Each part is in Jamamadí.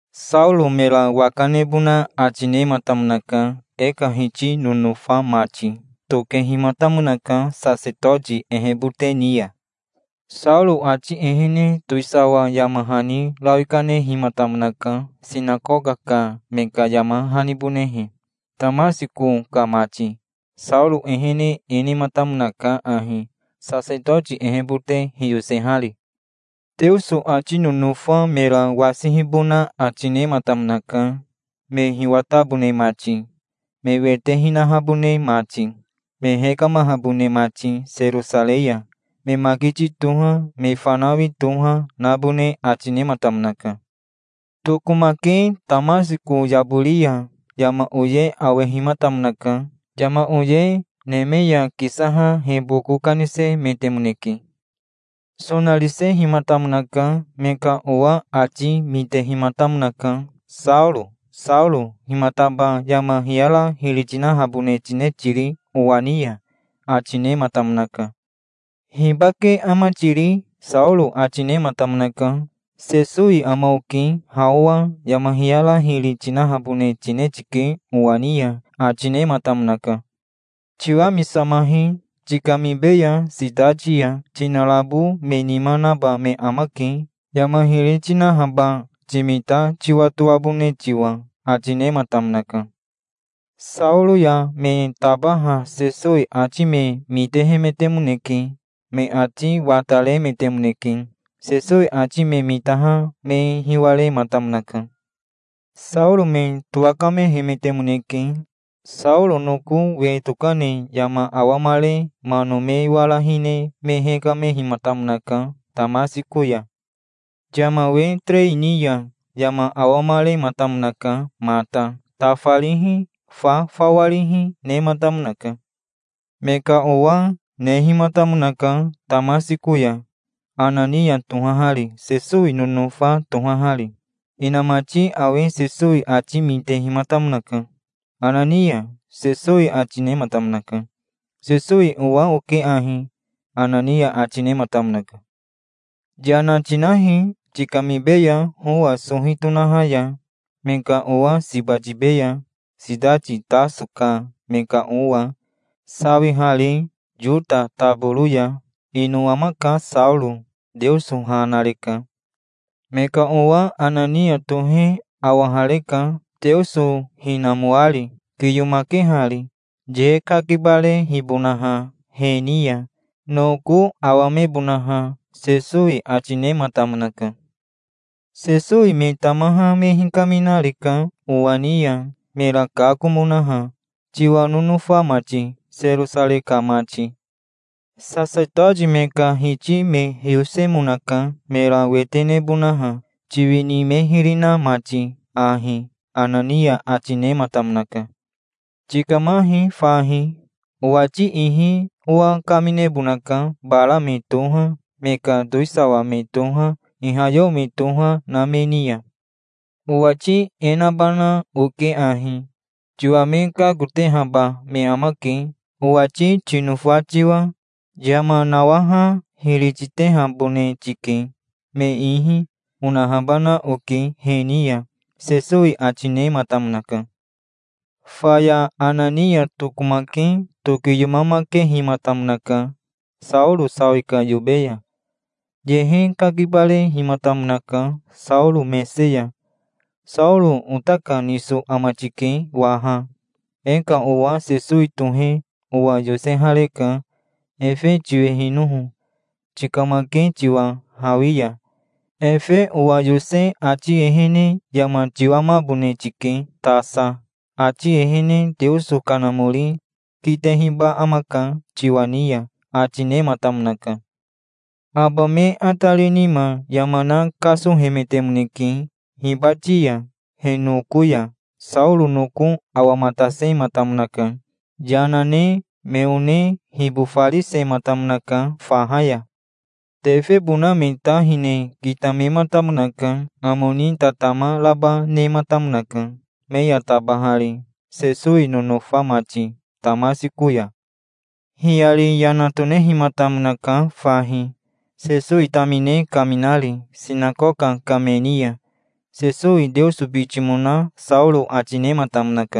Saoro mera waka nebona ati nematamonaka, e ka Hiti nonofa mati. Tokehimatamonaka sasetoti ehebote ni ya. Saoro ati ehene towisawa yama hani rawi kanehimatamonaka sinakoka ka me ka yama hanibonehe, Tamasiko ka mati. Saoro ehene e nematamonaka ahi, sasetoti ehebote hiyosehari: Teoso ati nonofa mera wasihibona ati nematamonaka, me hiwatabone mati, me wete hinahabone mati, me hekamahabone mati Serosarei ya. Me makiti toha, me fanawi toha, nabone ati nematamonaka. Tokomake Tamasiko yabori ya yama oye awehimatamonaka. Yama oye neme ya kisaha he boko kanisemetemoneke. Sonarisehimatamonaka. Me ka owa ati mitehimatamonaka. "Saoro, Saoro himataba yama hiyara hiri tinahabone tine tiri owa ni ya?" ati nematamonaka. "Hibake ama tiri?" Saoro ati nematamonaka. "Sesowi ama oke. Ha owa yama hiyara hiri tinahabone tine tike owa ni ya", ati nematamonaka. "Tiwamisamahi. Tikamibeya sitati ya. Tinarabo me nima naba me amake, yama hiri tinahaba timita tiwatoabone tiwa", ati nematamonaka. Saoro ya me tabaha Sesowi ati me mitehemetemoneke. Me ati wataremetemoneke. Sesowi ati me mitaha me hiwarematamonaka. Saoro me towakamehemetemoneke. Saoro noko we tokane yama awamare mano me wara hine me hekamehimatamonaka Tamasiko ya. Yama we terei ni ya yama awamarematamonaka mata. Tafarihi, fa fawarihi, nematamonaka. Me ka owa nehimatamonaka Tamasiko ya, Anania tohahari, Sesowi nonofa tohahari. Inamati awe Sesowi ati mitehimatamonaka. "Anania", Sesowi ati nematamonaka. "Sesowi owa oke ahi", Anania ati nematamonaka. "Yana tinahi. Tikamibeya howa sohi tonaha ya. Me ka owa siba tibeya, sitati Taso ka me ka owa, sawihari Yota taboro ya. Ino amaka Saoro. Teoso ha nareka. Me ka owa Anania tohe awahareka, Teoso hinamoari, kiyomakehari, ye kakibarehibonaha he ni ya, noko awamebonaha", Sesowi ati nematamonaka. "Sesowi me tamaha me hikaminareka owa ni ya, mera kakomonaha, tiwa nonofa mati, Serosarei ka mati. Sasetoti me ka hiti me hiyosemonaka, mera wete nebonaha, tiwini me hiri na mati ahi", Anania ati nematamonaka. "Tikamahi fahi. Owati ihi owa kaminebonaka bara me toha, me ka towisawa me toha, ihayeo me toha, na me ni ya. Owati e nabana oke ahi: 'Tiwa me kakotehaba me amake, owati tinofa tiwa. Yama nawaha hiri titehabone tike, me ihi', onahabana oke he ni ya", Sesowi ati nematamonaka. Faya Anania tokomake tokiyomamakehimatamonaka Saoro sawi ka yobe ya. Yehe kakibarehimatamonaka Saoro mese ya. "Saoro ota ka niso ama tike waha. E ka owa Sesowi tohe owa yosehareka, efe tiwehinoho, tikamake tiwa hawi ya. Efe owa yose ati ehene yama tiwamabone tike tasa. Ati ehene Teoso Kanamori kitehiba amaka tiwa ni ya", ati nematamonaka. Aba me atari nima yama na kasohemetemoneke hibati ya, he noko ya. Saoro noko awamatasematamonaka. Yana ne me one hibofarisematamonaka faha ya. Tefebona me ta hine kitamematamonaka. Amo ni tatama raba nematamonaka, me ya tabahari, Sesowi nonofa mati, Tamasiko ya. Hiyari yana tonehimatamonaka fahi, Sesowi tamine kaminari sinakoka ka me ni ya. Sesowi Teoso bitimona Saoro ati nematamonaka.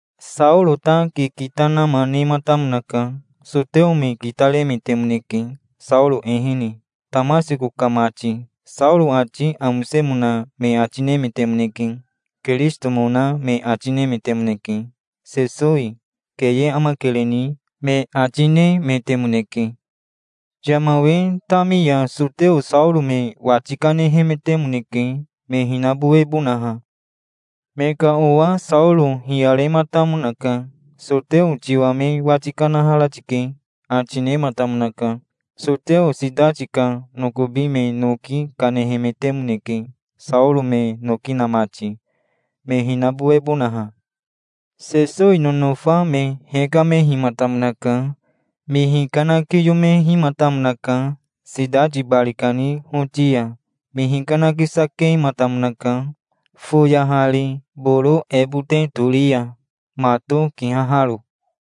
Saoro ta kikita nama nematamonaka. Soteo me kitaremetemoneke, Saoro ehene, Tamasiko ka mati. Saoro ati amosemona me ati nemetemoneke. Kirisitomona me ati nemetemoneke, Sesowi. "Keye amakereni", me ati nemetemoneke. Yama we tami ya soteo Saoro me wati kanehemetemoneke, me hinabowebonaha. Me ka owa Saoro hiyarematamonaka. "Soteo tiwa me wati kanahara tike", ati nematamonaka. Soteo sitati ka nokobi me noki kanehemetemoneke, Saoro me noki na mati, me hinabowebonaha. Sesowi nonofa me hekamehimatamonaka. Me hikanakiyomehimatamonaka sitati bari kani hoti ya. Me hikanakisakematamonaka foyahari boro ebote tori ya, mato kihaharo.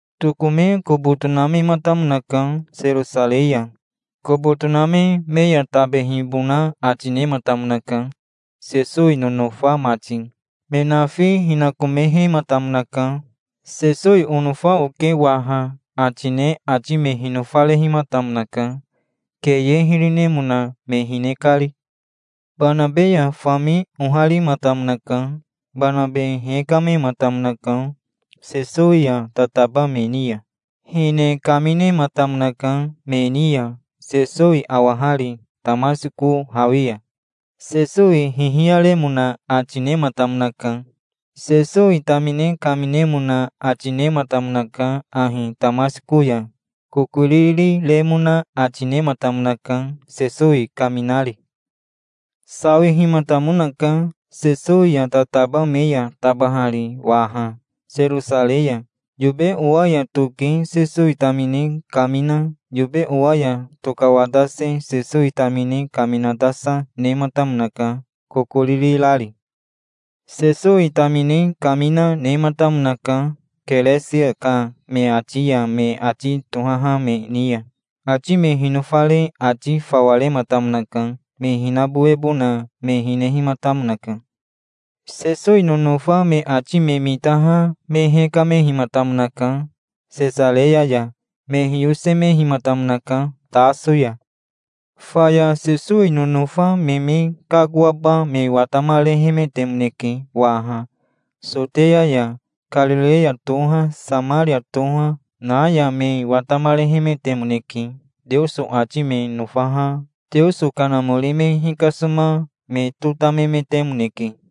Tokome kobo tonamematamonaka Serosarei ya. Kobo toname me ya tabehibona ati nematamonaka, Sesowi nonofa mati. Me nafi hinakomehematamonaka. "Sesowi onofa oke waha", ati ne ati me hinofarehimatamonaka, keye hiri nemona me hine kari. Banabe ya fami oharimatamonaka. Banabe hekamematamonaka Sesowi ya tataba me ni ya. Hine kaminematamonaka me ni ya, Sesowi awahari Tamasiko hawi ya. Sesowi hihiyaremona ati nematamonaka. Sesowi tamine kaminemona ati nematamonaka ahi Tamasiko ya. Kokoriri remona ati nematamonaka, Sesowi kaminari. Sawihimatamonaka Sesowi ya tataba me ya tabahari waha, Serosarei ya. Yobe owa ya toke Sesowi tamine kamina, yobe owa ya tokawatase Sesowi tamine kaminatasa, nematamonaka, kokoriri rari. Sesowi tamine kamina, nematamonaka Keresia ka me ati ya me ati tohaha me ni ya. Ati me hinofare ati fawa rematamonaka. Me hinabowebona me hinehimatamonaka. Sesowi nonofa me ati me mitaha me hekamehimatamonaka Sesareya ya. Me hiyosemehimatamonaka Taso ya. Faya Sesowi nonofa me me kakoaba me watamarehemetemoneke waha, Soteya ya. Karireya toha, Samaria toha, na ya me watamarehemetemoneke. Teoso ati me nofaha Teoso Kanamori me hikasoma me totamemetemoneke.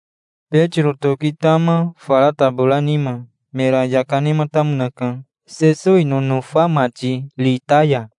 Betiro toki tama, fara tabora nima. Mera yaka, nematamonaka, Sesowi nonofa mati Rita ya.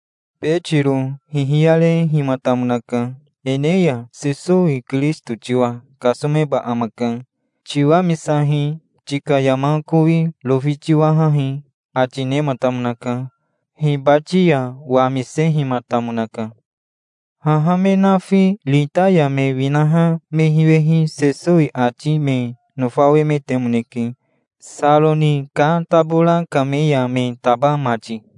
Betiro hihiyarehimatamonaka. "Eneya Sesowi Kirisito tiwa kasomeba amaka. Tiwamisahi. Tika yama kowi rofi tiwahahi", ati nematamonaka. Hibati ya wamisehimatamonaka. Haha me nafi Rita ya me winaha me hiwehi Sesowi ati me nofawemetemoneke, Saroni ka tabora ka me ya me taba mati.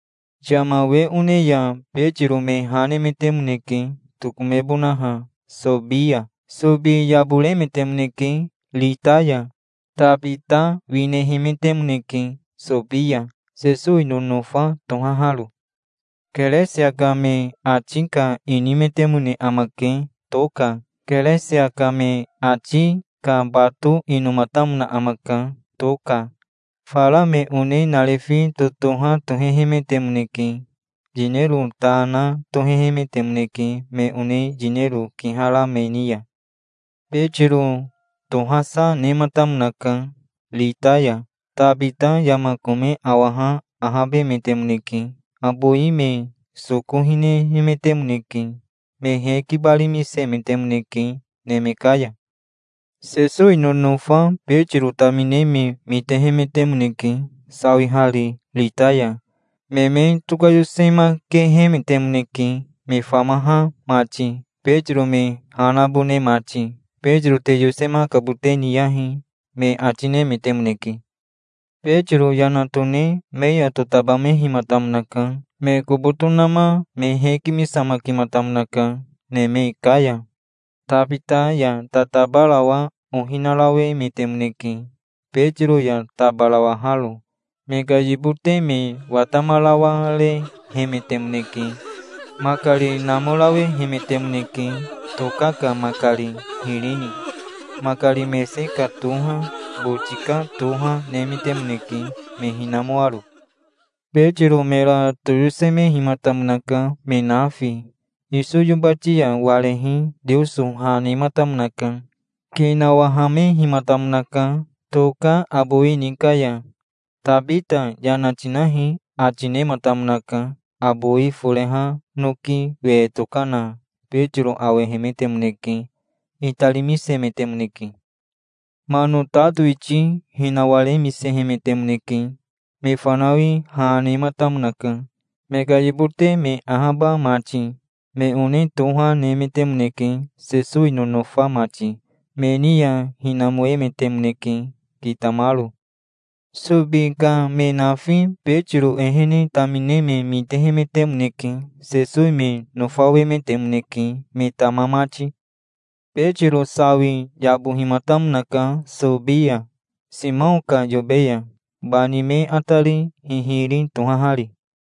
Yama we one ya Betiro me ha nemetemoneke, tokomebonaha Sobi ya. Sobi yaboremetemoneke Rita ya. Tabita winehemetemoneke Sobi ya, Sesowi nonofa tohaharo. Keresia ka me ati ka inimetemone amake, Toka. Keresia ka me ati ka bato inomatamona amaka, Toka. Fara me one narifi totoha tohehemetemoneke. Yinero ta na tohehemetemoneke me one yinero kihara me ni ya. Betiro tohasa nematamonaka Rita ya. Tabita yama kome awaha ahabemetemoneke. Abowi me soko hinehemetemoneke. Me hekibarimisemetemoneke neme ka ya. Sesowi nonofa Betiro tamine me mitehemetemoneke, sawihari Rita ya. Me me tokayosemakehemetemoneke, me famaha mati, Betiro me ha nabone mati. "Betiro te yosemakabote niyahi", me ati nemetemoneke. Betiro yana tone me ya totabamehimatamonaka. Me kobo tonama me hekimisamakimatamonaka neme ka ya. Tabita ya tatabarawa ohi narawemetemoneke, Betiro ya tabarawaharo. Me ka yibote me watamarawarehemetemoneke. Makari namorawehemetemoneke, Toka ka makari hiri ni. Makari mese ka toha, boti ka toha, nemetemoneke, me hinamoaro. Betiro mera toyosemehimatamonaka, me nafi. Iso yobati ya warehi Teoso ha nematamonaka. Ki nawahamehimatamonaka Toka abowi ni ka ya. "Tabita yana tinahi", ati nematamonaka. Abowi foreha noki we tokana Betiro awehemetemoneke. Itarimisemetemoneke. Mano ta towiti hinawaremisehemetemoneke. Me fanawi ha nematamonaka, me ka yibote me ahaba mati. Me one toha nemetemoneke, Sesowi nonofa mati. Me ni ya hinamoemetemoneke kitamaro. Sobi ka me nafi Betiro ehene tamine me mitehemetemoneke. Sesowi me nofawemetemoneke, me tama mati. Betiro sawi yabohimatamonaka Sobi ya, Simao ka yobe ya, bani me atari hihiri tohahari.